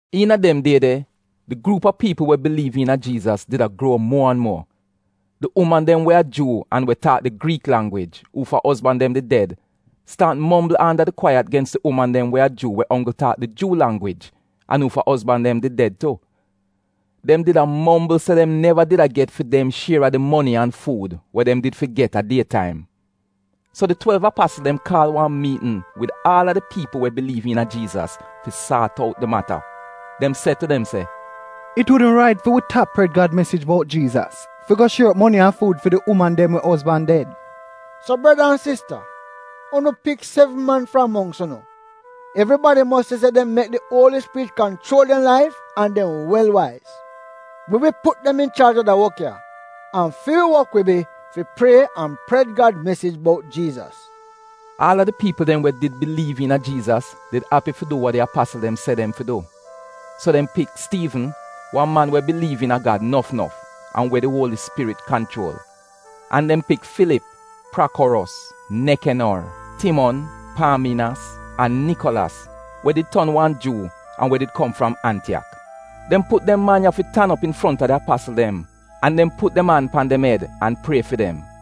Iina dem die de, di gruup a piipl we biliiv iina Jiizas did a gruo muo an muo. Di uman dem we a Juu an we taak di Griik langwij uufa ozban dem did ded, staat mombl anda di kwaiyat gens di uman dem we a Juu we onggl taak di Juu langwij an uufa ozban dem did ded tu. Dem did a mombl se dem neva did a get fi dem shier a di moni an fuud we dem fi get a die taim. So di twelv apasl dem kaal wan miitn wid aal a di piipl we biliiv iina Jiizas fi saat out di mata. Dem se tu dem se “It wudn rait fi wi tap pred Gad mesij bout Jiizas fi go shier op moni an fuud fi di uman dem we ozban ded. So breda an sista unu pik sevn man fram mongks unu. Evribadi mos nuo se di dem mek di Uoli Spirit kanchuol dem laif an nuo se dem wel waiz. Wi wi put dem inchaaj a da wok ya, an fi wi wok wi bi fi prie an pred Gad mesij bout Jiizas. Aal a di piipl dem we did biliiv iina Jiizas did api fi du wa di apasl dem did se dem fi du. So dem pik Stiivn, wan man we biliiv iina Gad nof nof an we di Uoli Spirit kanchuol. An dem pik Filip, Prakoros, Nekenor, Timon, Paaminas, an Nikolas we did ton wan Juu an we did kom fram Antiyak. Dem put dem man ya fi tan op infronta di apasl dem an dem put dem an pan dem ed an prie fi dem.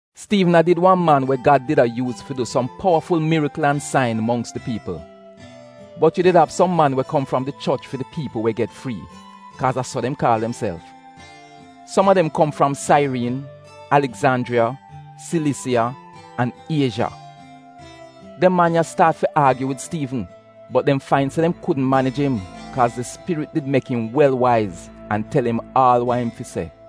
Stiivn a did wan man we Gad did a yuuz fi du som powaful mirikl an sain mongks di piipl. Bot yu did av som man we kom fram di Choch fi di Piipl we get Frii (kaaz a so dem kaal demself). Som a dem kom fram Sairiin, Aligzanjriya, Silisiya an Iezha. Dem man ya staat fi aagyu wid Stiivn, bot dem fain se dem kudn manij im kaaz di Spirit did mek im wel waiz an tel im aal wa im fi se.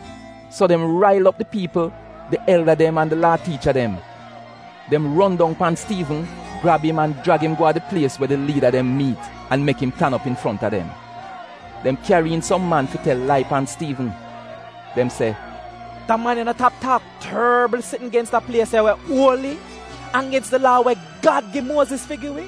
So dem rail op di piipl, di elda dem an di Laa tiicha dem. Dem ron dong pan Stiivn, grab im an jrag im go a di plies we di liida dem miit an mek dem tan op infronta dem. Dem kyari iin som man fi tel lai pan Stiivn. Dem se “Da man ya no tap taak torbl sitn gens da plies ya we uoli, an gens di Laa we Gad gi Muoziz fi gi wi.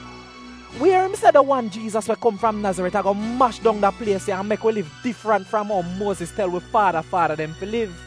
Wi ier im se di wan Jiizas we kom fram Nazaret ago mash dong da plies ya an mek wi liv difrant fram ou Muoziz tel wi faada faada dem fi liv.”